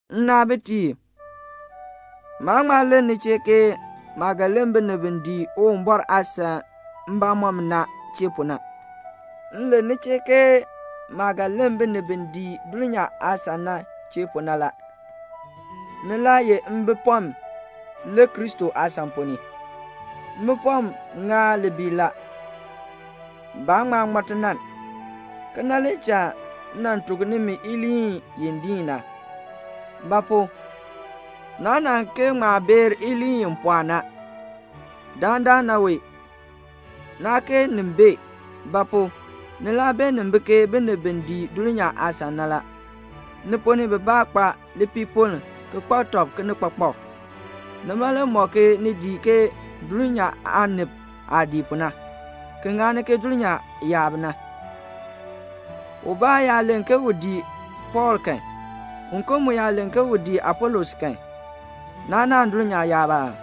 Nnaabitiib, maa ŋma len ni chee ke maah ga len binib bi dii Uwumbɔr aasan mbamɔm na chee pu na. M len ni chee ke maah ga len binib bi dii dulnyaa aasan na chee pu na la. Ni laa ye mbipɔm le Kristo aasan ponn ni. Mbipɔm ŋaan libiil la. Baa ŋma ŋmɔ tinann. Kena le cha m nan tuk nimi iliin i diin na. Ba pu? naa nan kee ŋma beer iliin i pɔɔ na. Dandana wee naa kee nin bee. Ba pu? ni laa beenin bi ke binib bi dii dulnyaa aasan na la. Ni ponn ni bibaa kpa lipiipoln ki kpak tɔb kinikpakpak. Nima le mɔk ke ni dii ke dulnyaa aanib aah dii pu na, ki ŋani ke dulnyaa yaab na. Ubaa yaa len ke u dii Pɔɔl kan, uken mu yaa len ke u dii Apolos kan, naa naahn dulnyaa yaab aa?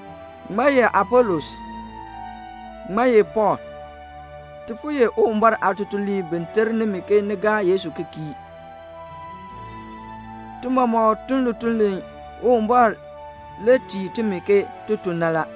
Ŋmaa ye Apolos? Ŋmaa ye Pɔɔl? Ti po ye Uwumbɔr aatutuliib bi ter nimi ke ni gaa Yesu ki kii. Ti mɔmɔk tun lituln li Uwumbɔr le tii timi ke ti tun na la.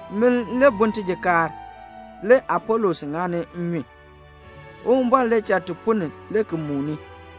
Min le bun tijikaar, le Apolos ŋani nnyun; Uwumbɔr le cha ti punni le ki muuni.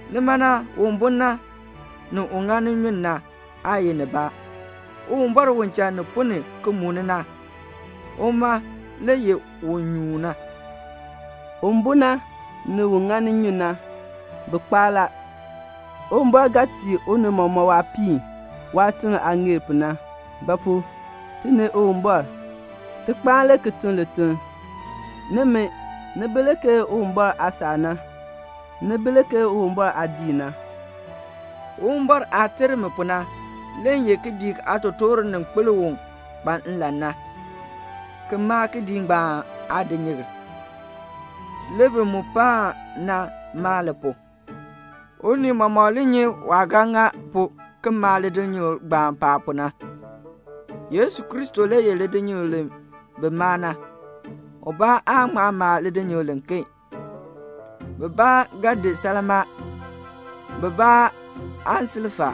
Nima na, un bun na, ni un ŋani nnyun na, aa ye nibaa. Uwumbɔr u cha ti punni ki muuni na, uma le ye un nyuun na. Un bun na, ni un ŋani nnyun na, bi kpaa la. Uwumbɔr ga tii unii mɔmɔk waapiin, waatuln aah ŋeer pu na. Ba pu? ti ni Uwumbɔr, ti kpaan le ki tun lituln. Nimi, ni bi le ke Uwumbɔr aasaak na. Ni bi le ke Uwumbɔr aadiik na. Uwumbɔr aah ter mi pu na, le m ye kidiik aatotoor aaninkpil u kpa nlan na, ki maa kidiik ngbaan aadinyikl. Le bi mu paan na maa li pu. Unii mɔmɔk li nyi waah ga ŋa pu ki maa lidinyikl ngbaan paab pu na. Yesu Kristo le ye lidinyikl li bi maa na. Ubaa aa ŋma maa lidinyikl liken. Bibaa ga di salmaa, bibaa aansilfa,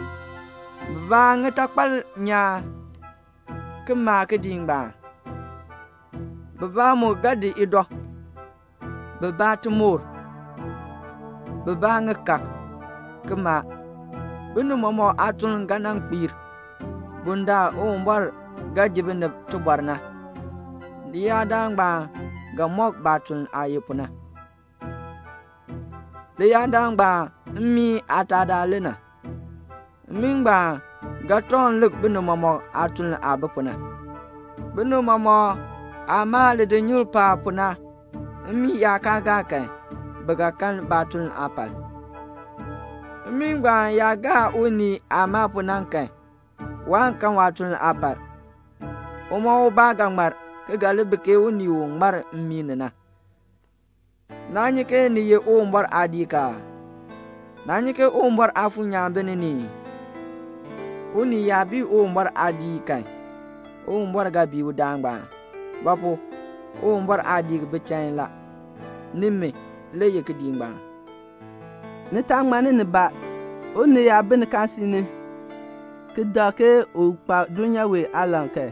bibaa ŋitakpal nyaan, ki maa kidiik ngbaan; bibaa mu ga di idɔ, bibaa timoor, bibaa ŋikaak, ki maa. Binib mɔmɔk aatuln ga nan kpiir. Bundaln Uwumbɔr ga ji binib tibɔr na, leyaadaal ngbaan ga mɔk baatuln aah ye pu na. Leyaadaal ngbaan mmii aataadaal le na. Mmii ngbaan ga tɔŋ lik binib mɔmɔk aatuln aah bi pu na. Binib mɔmɔk aah maa lidinyikl paab pu na, mmii yaa kaa gaa kan, bi ga kan baatuln aapal. Mmii ngbaan yaa gaa unii aah maa pu na kan, waan kan waatuln aapal. Uma ubaa ga ŋmar, ki ga li bi ke unii u ŋmar mmii ni na. Naa nyi ke ni ye Uwumbɔr aadiik aa? Naa nyi ke Uwumbɔr Aafuur nyaan bi ni ni ii? Unii yaa bii Uwumbɔr aadiik kan, Uwumbɔr ga bii udaan ngbaan. Ba pu? Uwumbɔr aadiik bi chain la. Nimi le ye kidiik ngbaan. Ni taa ŋmanni nibaa. Unii yaa bi nikaasisik ni ki dak ke u kpa dulnyaa wee aalan kan,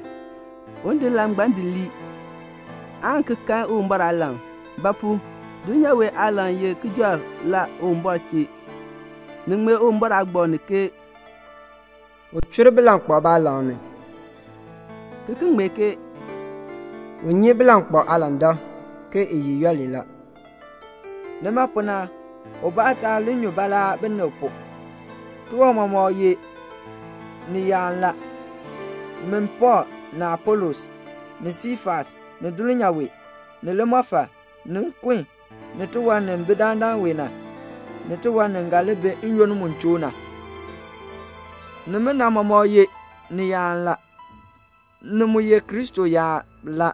un di nlan ngbaan di lii, aan ki kan Uwumbɔr aalan. Ba pu? dulnyaa wee aalan ye kijɔrk la Uwumbɔr chee. Ni ŋmee Uwumbɔr aagbaŋ ni ke "U chur bilankpalb baalan ni," ki ki ŋmee ke "U nyi bilankpalb aalandak, ke i ye yooli la." Nima pu na, ubaa taa li nyu baalaa binib pu. Tiwan mɔmɔk ye niyaan la. Min Pɔɔl, ni Apolos, ni Siifas, ni dulnyaa wee, ni limɔfal, ni nkun, ni tiwan ni bi dandana na, ni tiwan ni ga li bi n-yoonn mu choo na, nimina mɔmɔk ye niyaan la. Ni mu ye Kristo yaab la.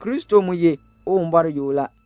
Kristo mu ye Uwumbɔr yoo la.